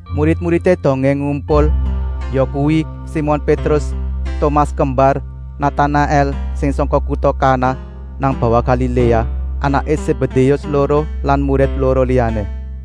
Murid-muridé dongé pada ngumpul, yakuwi Simon Pétrus, Tomas Kembar, Natanaèl sing sangka kuta Kana nang bawah Galiléa, anaké Sébédéus loro lan murid loro liyané.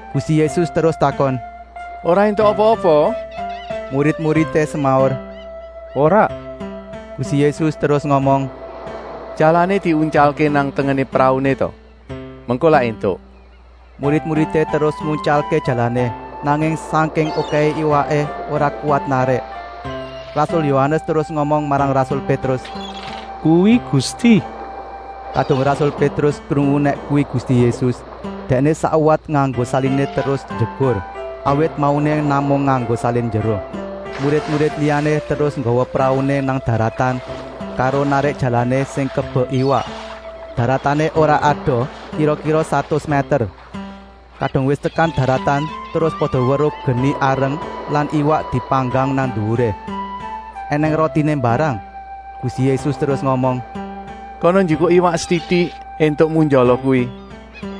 Gusti Yésus terus takon: “Ora éntuk apa-apa?” Murid-muridé semaur: “Ora!” Gusti Yésus terus ngomong: “Jalané diuntyalké nang tengené prauné ta, mengko lak éntuk!” Murid-muridé terus nguntyalké jalané, nanging sangking okèhé iwaké ora kuwat narik. Rasul Yohanes terus ngomong marang rasul Pétrus: “Kuwi Gusti!” Kadung rasul Pétrus krungu nèk kuwi Gusti Yésus, dèkné sakwat nganggo saliné terus njegur, awit mauné namung nganggo salin njero. Murid-murid liyané terus nggawa prauné nang daratan karo narik jalané sing kebek iwak. Daratané ora adoh, kira-kira satus mèter. Kadung wis tekan daratan terus pada weruh geni areng lan iwak dipanggang nang nduwuré. Enèng rotiné mbarang. Gusti Yésus terus ngomong: “Kana njikuk iwak setitik éntukmu njala kuwi!”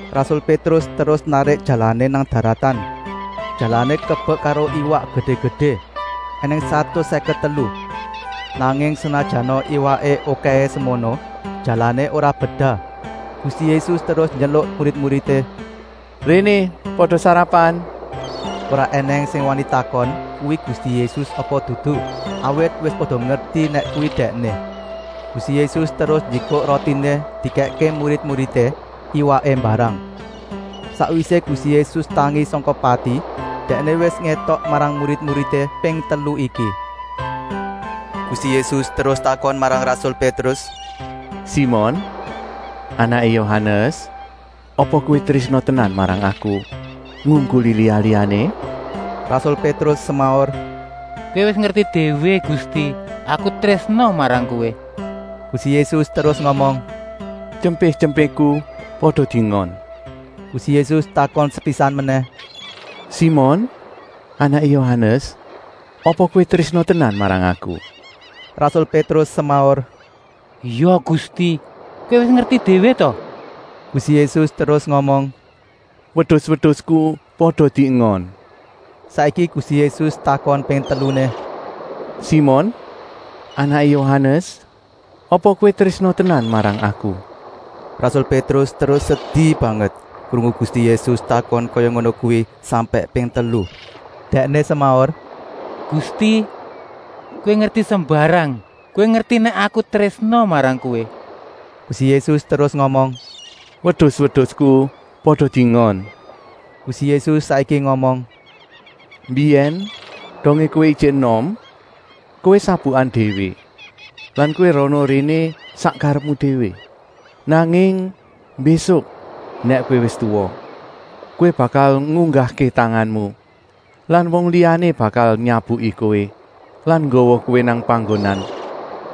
Rasul Pétrus terus narik jalané nang daratan. Jalané kebek karo iwak gedé-gedé, ènèng satus sèket telu, nanging senajana iwaké okèhé semono, jalané ora bedah. Gusti Yésus terus nyeluk murid-muridé: “Réné pada sarapan!” Ora ènèng sing wani takon kuwi Gusti Yésus apa dudu, awit wis pada ngerti nèk kuwi Dèkné. Gusti Yésus terus njikuk rotiné dikèkké murid-muridé, iwaké mbarang. Sakwisé Gusti Yésus tangi sangka pati Dèkné wis ngétok marang murid-muridé ping telu iki. Gusti Yésus terus takon marang rasul Pétrus: “Simon, anaké Yohanes, apa kowé trésna tenan marang Aku, ngungkuli liya-liyané?” Rasul Pétrus semaur: “Kowé wis ngerti déwé Gusti, Aku trésna marang Kowé!” Gusti Yésus terus ngomong: “Tyempé-tyempéku pada diengon!” Gusti Yésus takon sepisan menèh: “Simon, anaké Yohanes, apa kowé trésna tenan marang Aku?” Rasul Pétrus semaur: “Ya Gusti, Kowé wis ngerti déwé ta!” Gusti Yésus terus ngomong: “Wedus-wedusku pada diengon!” Saiki Gusti Yésus takon ping teluné: “Simon, anaké Yohanes, apa kowé trésna tenan marang Aku?” Rasul Pétrus terus sedi banget krungu Gusti Yésus takon kaya ngono kuwi sampèk ping telu. Dèkné semaur: “Gusti, Kowé ngerti sembarang. Kowé ngerti nèk Aku trésna marang Kowé!” Gusti Yésus terus ngomong: “Wedus-wedusku pada diengon!” Gusti Yésus saiki ngomong: “Mbiyèn dongé kowé ijik enom, kowé sabukan déwé lan kowé rana-réné sak karepmu déwé. Nanging mbésuk nèk kowé wis tuwa, kowé bakal ngunggahké tanganmu lan wong liyané bakal nyabuki kowé lan nggawa kowé nang panggonan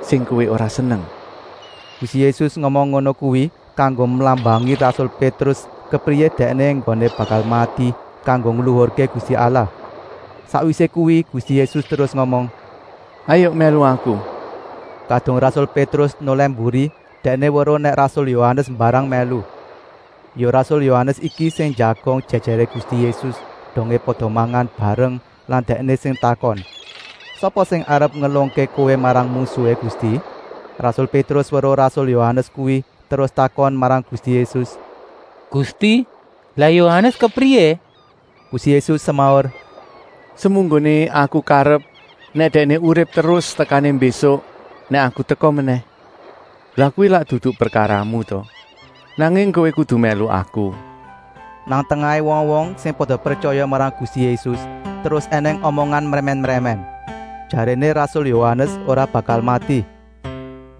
sing kowé ora seneng.” Gusti Yésus ngomong ngono kuwi kanggo mlambangi rasul Pétrus kepriyé dèkné enggoné bakal mati kanggo ngluhurké Gusti Allah. Sakwisé kuwi Gusti Yésus terus ngomong: “Hayuk mèlu Aku!” Kadung rasul Pétrus nolèh mburi dèkné weruh nèk rasul Yohanes mbarang mèlu. Ya rasul Yohanes iki sing njagong jèjèré Gusti Yésus dongé pada mangan bareng lan dèkné sing takon: “Sapa sing arep ngelungké Kowé marang mungsuhé, Gusti?” Rasul Pétrus weruh rasul Yohanes kuwi terus takon marang Gusti Yésus: “Gusti, lah Yohanes kepriyé?” Gusti Yésus semaur: “Semunggoné Aku karep nèk dèkné urip terus tekané mbésuk nèk Aku teka menèh, lah kuwi lak dudu prekaramu ta! Nanging kowé kudu mèlu Aku!” Nang tengahé wong-wong sing pada pretyaya marang Gusti Yésus terus ènèng omongan mrèmèn-mrèmèn, jaréné rasul Yohanes ora bakal mati.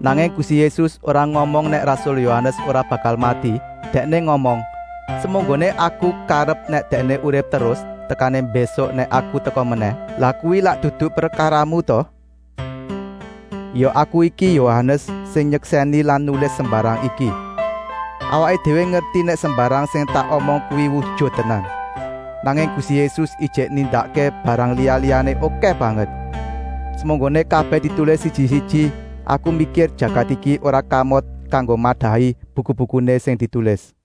Nanging Gusti Yésus ora ngomong nèk rasul Yohanes ora bakal mati, Dèkné ngomong: “Semunggoné Aku karep nèk Dèkné urip terus tekané mbésuk nèk Aku teka menèh, lah kuwi lak dudu prekaramu ta?” Ya aku iki, Yohanes, sing nyeksèni lan nulis sembarang iki. Awaké déwé ngerti nèk sembarang sing tak omong kuwi wujut tenan. Nanging Gusti Yésus ijik nindakké barang liya-liyané okèh banget. Semunggoné kabèh ditulis siji-siji, aku mikir jagat iki ora kamot kanggo madahi buku-bukuné sing ditulis.